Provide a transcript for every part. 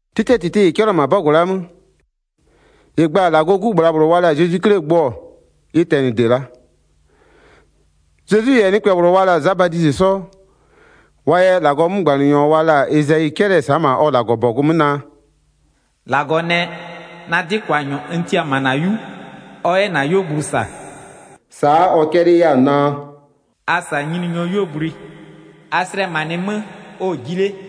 'Tɩtɩɛ -tɩtɩ -ɩ 'cɛlɩɔ-ɔ ma'a 'bɔgʋ la'a 'mö, -ɩ gba-a -Lagɔɔ 'Gu -bhlabhlʋ wa la-a Zezwi 'Klie gbʋ-ɔ, ɩ tɛnɩde la'a. Zezwi -yɛ nɩkpɛ -bhlʋ wa la-a Za Badizɩ 'sɔ, wa yɛ -Lagɔɔ 'mögbanɩnyɔ wa la-a Ezayi 'cɛlɩ-ɛ sa'a -ma ɔ -Lagɔbɔgʋ 'mö naa: “-Lagɔ nɛ: Na 'dɩkwanyɔ n tia-a -ma -na 'yu, ɔ 'yɛ -na 'yuogblʋ -sa.” Sa'a ɔ 'cɛlɩɩ 'yɛ-a naa: “A -sa Nyininyɔɔ 'yuogblʋɩ, a slɛmanɩɩ 'mö, ɔ-ɔ ji 'le.”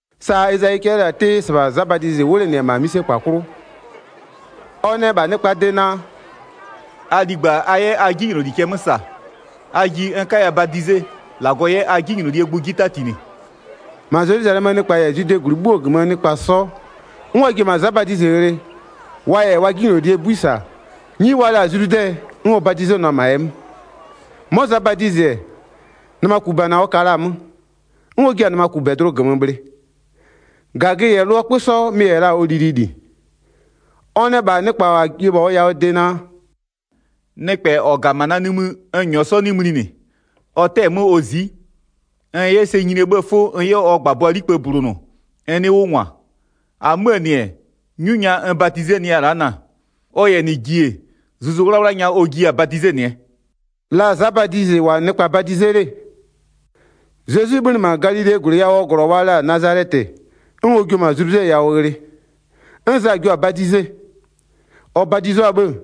Sa Ezayi 'cɛlɩɩ la-a 'tɩɩ, -sɩbha Za Badizɩ 'wlenɩɩ-ɛ -ma 'mïsekpa 'klʋ 'wʋ. Ɔ nɛ -bha nɩkpaa de naa: “A ligba, a 'yɛ a 'jinyloli cɛ 'mö -sa, a ji n 'kaya badize, -Lagɔ 'yɛ a 'jinylolie gbʋ 'ji 'tatinɩ.” 5-Ma Zelwizalɛmöö nɩkpa -yɛ Zwidee -gwlɩ 'bhuo -gömöö -lʋa 'sɔ, 'n wa ji-e -ma Za Badizɩ ghlɩ, wa -yɛ wa 'jinylolie 'bui -sa, 'nyi wa la-a Zludɛ, 'n ɔ badizenʋa-a -ma ɛ 'mö. 'Mɔ Za Badizɩ-ɛ, nɩmakubana ɔ ka la-a 'mö, 'n ɔ jia-a nɩmakubɛdlʋ -gömö bhlɩ. -Gagö -yɛ lʋɔ 'kpö 'sɔ mɩ-ɩ -yɛ la-a ɔ lilili. Ɔ nɛ -bha nɩkpa -wa ji-e -bha ɔ yawʋɔ de naa: “Nɩkpɛ -ɔ -ga-a -ma na nimï n -nyɔɔ 'sɔ 'nɩ mlinɩ, ɔ 'tɛ-ɛ 'mö ɔ zi'i, n 'yɛ sɛ nyinie 'bhëë 'fʋ n 'yɛ ɔ -gbabʋaa 'likpï bulonʋ n 'nɩɩ 'wʋ -ngwa. 8-Amöö -nɩ-ɛ, 'nyu nya n badizenɩya-a la'a na-a, ɔ -yɛ -nɩ ji-e, Zuzu 'Wlawla nya ɔ jiya-a badizenɩɛ.” La Za Badizɩ -wʋ-a nɩkpa badize 'le, Zezwi 'bhönɩ -ma Galilee -gwlɩ yawʋɔ -glɔ wa la-a Nazalɛtɩ, 'n ɔ jio-o -ma Zludɛ yawʋ ghlɩ, 'n Za jio-a badize. Ɔ badizo-a 'bhë,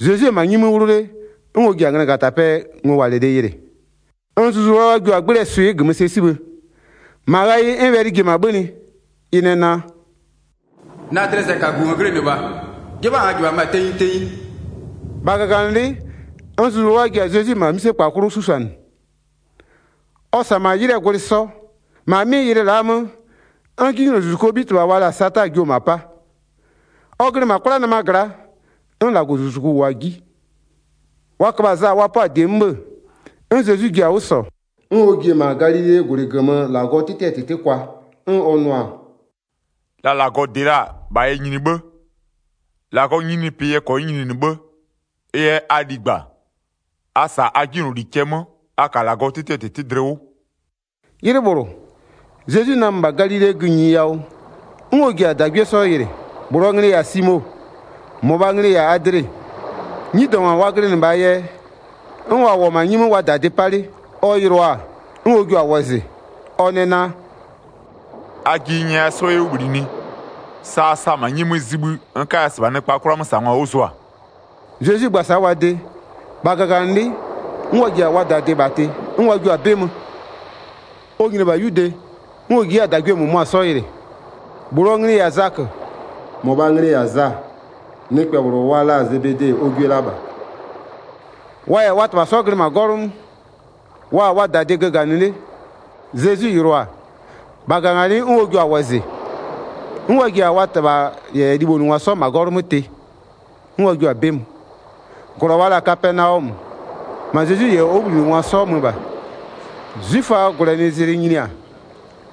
Zezwi-e -ma 'nyi 'mö 'wlʋ 'le, 'n ɔ ji-a nglagatapɛɛ ngowalɩlɩ yɩlɩ, 'n Zuzu 'Wlawla jio-a 'gblɩɛ swɩ'ɩ -gömö sɛ 'sibhë. 11-Ma ghayɩ 'n wɛlɩ ji-e -ma 'bhönɩ, ɩ nɛ naa: “Na dlɩɛ sɛkagu -n glɩnɩ -bha, 'jɩbha n -jɩbhamö-a tenyi tenyi.” 12-Bha -gaganɩlɩ'ɩ, 'n Zuzu 'Wlawla ji-a Zezwi -ma 'mïsekpa 'klʋ 'susʋanɩ. Ɔ -sa -ma 'ylɩɛ gwlɩ 'sɔ. -Ma 'mɩ ylɩ la'a 'mö, 'n 'jinylozuzukuo 'bhitɩbha wa la-a Sata jio-o -ma 'pa. Ɔ glɩ -ma 'kwlanɩma gla'a, 'n -Lagɔzuzuku -wʋɔ-a 'ji. Wa köbha-a Za wa 'pɔ-a -die 'mö 'bhë-ë, 'n Zezwi ji-a 'wʋ -sɔ, 'n ɔ ji-e -ma Galilee -gwlɩ -gömö -Lagɔɔ 'tɩtɩɛ -tɩtɩ kwa. 'N ɔ nʋ-a: “La -Lagɔ -dɩ la-a, -bha yɛ nyini 'bhë, -Lagɔɔ nyininyinipɩ yɛ -kɔnyɩ nyininɩ 'bhë. Ɩ yɛ a ligba, a -sa a 'jinyloli cɛ 'mö, a -ka -Lagɔɔ 'tɩtɩɛ -tɩtɩ dlɩ 'wʋ.” 'Ylɩ -bhlʋ, Zezwi namö -bha Galilee gïnyi yawʋ, 'n ɔ ji-a -dagwie 'sɔ yɩlɩ, -bhlʋɔ nglɩ-ɩ -yɛ-a Simo, -mɔbhaa nglɩ-ɩ -yɛ-a Adle, 'nyidɔngwa wa glɩnɩ -bhaa yɛ, 'n wa -wʋ-ɔ -ma 'nyi 'mö wa -dadɩ 'pa 'le. Ɔ yɩlʋa-a, 'n ɔ jua-a wɔzɩ, ɔ nɛ naa: “A ji n nyɛya 'sɔ 'yɛ 'wʋ -bhlinɩ, sa a sa-a -ma 'nyi 'mö zibhï, n 'kaya -sɩbha nɩkpaa 'kwlamösangwa 'wʋ zʋa.” Zezwi gba-a sa'a wa de, -bha -gaganɩlɩ'ɩ, 'n wa ji-a wa -dadɩ -bha tɩ, 'n wa jio-a 'bɩ mö. Ɔ nyini-e -bha 'yude, 'n ɔ ji 'yɛ-a -dagwie -mʋmʋa 'sɔ yɩlɩ, -bhlʋɔ nglɩ-ɩ -yɛ-a Zakö, -mɔbhaa nglɩ-ɩ -yɛ-a Za, nɩkpɛ -bhlʋ wa la-a Zebede ɔ gwie la -bha. Wa -yɛ wa -tɩbha 'sɔ glɩ -ma 'gɔlʋ 'mö, wa-a wa -dadɩ göganɩ 'le. Zezwi yɩlʋa-a, -bha -gaganɩlɩ'ɩ 'n ɔ jua-a wɔzɩ, 'n wa ji-a wa -tɩbha -yɛ libhonʋngwa 'sɔ -ma 'gɔlʋ 'mö tɩ, 'n wa jio-a 'bɩ mö. Zezwi yɛ nɩkpɛ -bhlʋ 'jinylozuzuko -gömö kpëti 21-Glɔ wa la-a Kapɛnaɔmö, -ma Zezwi -yɛ ɔ 'wʋbhlinɩngwa 'sɔ mö -bha. 'Zwiföaa -gwlɛnɩzlɩ nyini-a,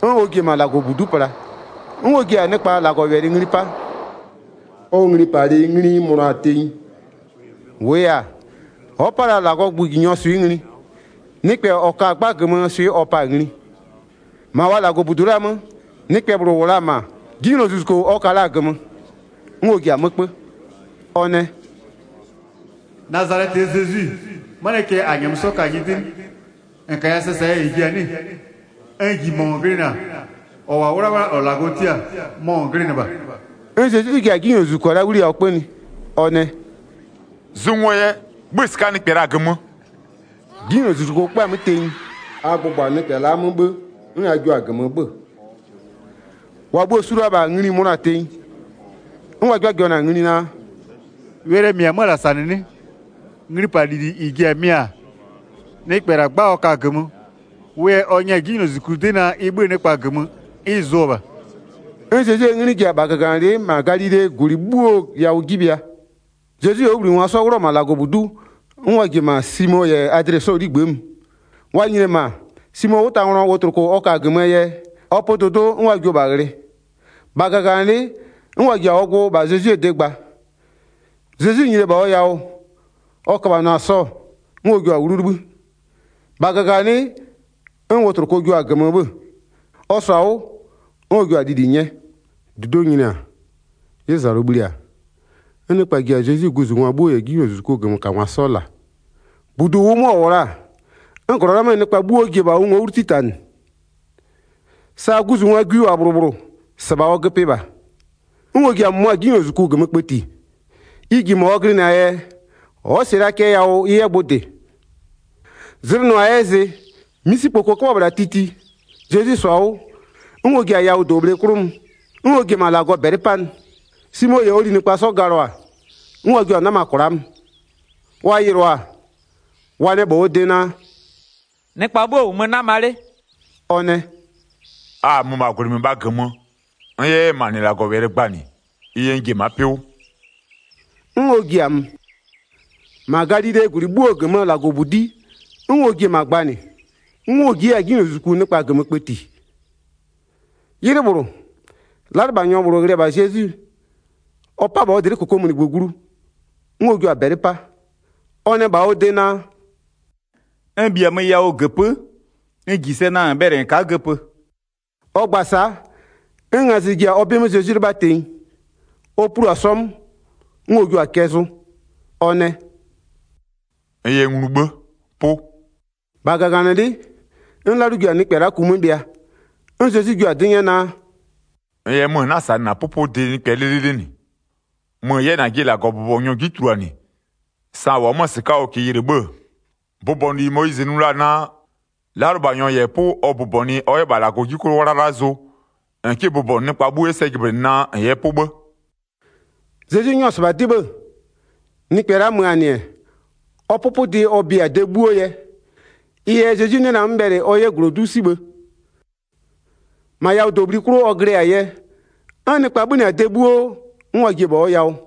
'n ɔ ji-e -ma -Lagɔbudu'u pla, 'n ɔ ji-a nɩkpa -Lagɔwɛlɩ ngli 'pa. Ɔ nglipalɩ ngli ɩ mönʋa-a tenyi. -Wʋʋ yɛ-a, ɔ'ɔ 'pa la -Lagɔɔ gböö nglipangwaa swɩ'ɩ ngli, nɩkpɛ -ɔ ka-a 'gba -gömöö swɩ'ɩ ɔ pa-a ngli. 23-Ma wa -Lagɔbudu la'a 'mö, nɩkpɛ -bhlʋ -wʋ la-a -ma, 'jinylozuzuko ɔ ka la-a -gömö. 'N ɔ ji-a 'mö 'kpö, ɔ nɛ: “Nazalɛtɩɛ Zezwi, 'manɩɛ cɛ -a -nyɛmö 'sɔ ka-a nyɩdɩ 'nɩ? -N -kaya sɛ -saa yɛ -n ji-a 'nɩ-ɩ? N -ji -mɔ -n glɩnɩ-a. -Ɔ -wʋ-a 'wlawla -ɔ -Lagɔ tia-a, mɔ -n glɩnɩ -bha.” 'N Zezwi ji-a 'jinylozuzuko la'a 'wliyawʋ 'kpönɩ, ɔ nɛ: “Zʋ ngo yɛ, 'bhö-ö -sɩka'a nɩkpɛ -la -gömö.” 'Jinylozuzuko 'kpö-a 'mö tenyi, a gbʋgbɔ-a nɩkpɛ la'a 'mö 'bhë, 'n a jio-a -gömö 'bhö-ö. 27-Wa bhuo-o su la-a -bha ngli-i mönʋa-a tenyi, 'n wa 'jɩbhajɩbhanɩ-a ngli naa: “Wɛlɩɛ -mɩ-ɛ 'mö-ö -la -sa -nɩ 'nɩ? Nglipalɩ -lili -ɩ ji-a mɩ-a? Nɩkpɛ -la 'gba ɔ ka-a -gömö, wʋ yɛ ɔ nyɛ-a 'jinylozuzuku 'dɩ naa ɩ 'bhö-ö nɩkpa -gömö, 'n ɩ zʋɔ-ɔ -bha.” 'N Zezwie 'nglɩ ji-e -bha -gaganɩlɩ'ɩ -ma Galilee -gwlɩ 'bhuo yawʋ 'ji bhɩa. Zezwi -yɛ ɔ 'wʋbhlinɩngwa 'sɔ 'wlʋ-ɔ -ma -Lagɔbudu'u, 'n wa ji-e -ma Simo -yɛ Adle 'sɔɔ 'ligbë'ë mö. Wa nyini-e -ma, Simoo 'wʋtanglɔ wotloko ɔ ka-a -gömöö yɛ, ɔ pö dʋdʋ'ʋ 'n wa jio-o -bha ghlɩ. -Bha -gaganɩlɩ'ɩ, 'n wa ji-a ɔ gbʋ -bha Zezwie de gba. Zezwi nyini-e -bha ɔ yawʋ, ɔ köbhanɩɔ-a sɔ, 'n ɔ jio-a 'wlu 'libhï. -Bha -gaganɩlɩ'ɩ, 'n wotloko jio-a -gömö 'bhö-ö. Ɔ -sɔ-a 'wʋ, 'n ɔ jua-a lili 'nyɛ. 32-Dudo'o nyini-a, 'ylʋzalʋ bhli-a, 'n nɩkpa ji-a Zezwi guzungwa 'bhuo -yɛ 'jinylozuzukuo -gömökangwa 'sɔ -la. 33-Budu -ʋʋ 'mö ɔ -wʋ la-a, 'n -glɔ la'a 'möö nɩkpa 'bhuo ji-e -bha ʋ ngo'o 'wlu 'titanɩ. Sa guzungwaa gwi -wʋ-a -bhlʋ -bhlʋ -sɩbha ɔ göpɩ -bha. 'N ɔ ji-a -mʋmʋa 'jinylozuzuku -gömö kpëti. Ɩ -ji -mɔ ɔ glɩnɩ-aa yɛ, ɔ'ɔ -sɩɩ la cɛ yawʋ ɩ 'yɛ gbʋ -dɩ. Zlɩ nʋ-a ɛ 'yɛ zɩ-ɛ, 'misikpoko 'köbhɔ-ɔ -bhla titi, Zezwi -sɔ-a 'wʋ, 'n ɔ ji-a yawʋdobhle -bhlʋ 'klʋ mö, 'n ɔ ji-e -ma -Lagɔ -bɛlɩ 'panɩ. Simo -yɛ ɔ linɩkpa 'sɔ galɔ-a, 'n wa jio-a 'nama kwla'a mö. Wa yɩlɩɔ-a, wa nɛ -bha ɔ de naa: “Nɩkpa 'bhuo -wʋmö 'nama 'le.” Ɔ nɛ: “A-a mö -ma yawʋɔ -gwlɩ -mɩbhaa 'mö, n 'yɛ 'yɛ -ma -nɩ -Lagɔwɛlɩ gbanɩ, ɩ yɛ n ji-e ma'a 'pɩ 'wʋ.” 'N ɔ ji-a mö, -ma Galilee -gwlɩ 'bhuo -gömöö -Lagɔbudi'i, 'n ɔ ji-e -ma gbanɩ, 'n ɔ ji 'yɛ-a 'jinylozuzuku nɩkpa -gömö kpëti. 'Ylɩ -bhlʋ, 'lalʋlɩbhanyɔ -bhlʋ ghlɩ-ɛ -bha Zezwi, ɔ 'pa-a -bha ɔ dlɩ'ɩ -kokomunigbö glu-o, 'n ɔ jio-a -bɛlɩ 'pa, ɔ nɛ -bha ɔ de naa: “N -bhiamö yawʋ -göpö'ö, n -ji sɛ naa -n bhɛlɩ -n ka'a göpö.” Ɔ gba-a sa'a, 'n ngazɩ ji-a ɔ 'bɩ 'mö Zezwi 'lɩbha tenyi, ɔ plu-a sɔ 'mö, 'n ɔ jio-a cɛ zʋ, ɔ nɛ: “N yɛ nglu 'bhë, 'pʋ.” 42-Bha -gaganɩlɩ'ɩ, 'n 'lalʋ ji-a nɩkpɛ la'a ku 'mö bhɩa. 'N Zezwi jio-a 'dɩ 'nyɛ naa: “-N -yɛ mö, -n 'na-a -sanɩ -na 'pʋpʋdɩ -bɛ 'lɩlɩlɩ -nɩ. Mö -n 'yɛ -najɩ -Lagɔbʋbɔnyɔ 'ji tuluanɩ, sa -n -wʋ-ɔ 'mö-a -sɩka'a ɔ -kɩɩ yɩlɩ 'bhë-ë, bʋbɔnʋli Moyizɩ nʋ la-a naa, 'lalʋlɩbhanyɔ -yɛ 'pʋ ɔ bʋbɔnʋɩ ɔ 'yɛ -bha -Lagɔɔ 'ji 'klʋ 'wlala zʋ, -n 'kɩ bʋbɔnʋ nɩkpa 'bhuo 'yɛ sɛ jɩblɩnɩ naa -n yɛ 'pʋ 'bhë.” Zezwi 'nyɔ-ɔ -sɩbha 'dɩ 'bhë-ë, nɩkpɛ la'a mö-a -nɩ-ɛ, ɔ 'pʋpʋdɩ ɔ bia-a de 'bhuo yɛ. Ɩ yɛ Zezwi 'nɩ la-a 'mö bhɛlɩ ɔ 'yɛ -glodu'u 'sibhë, -ma yawʋdobhli 'klʋ ɔ glɩ-a yɛ, 'n nɩkpa 'bhönɩ-a de 'bhuo 'n wa ji-e -bha ɔ yawʋ.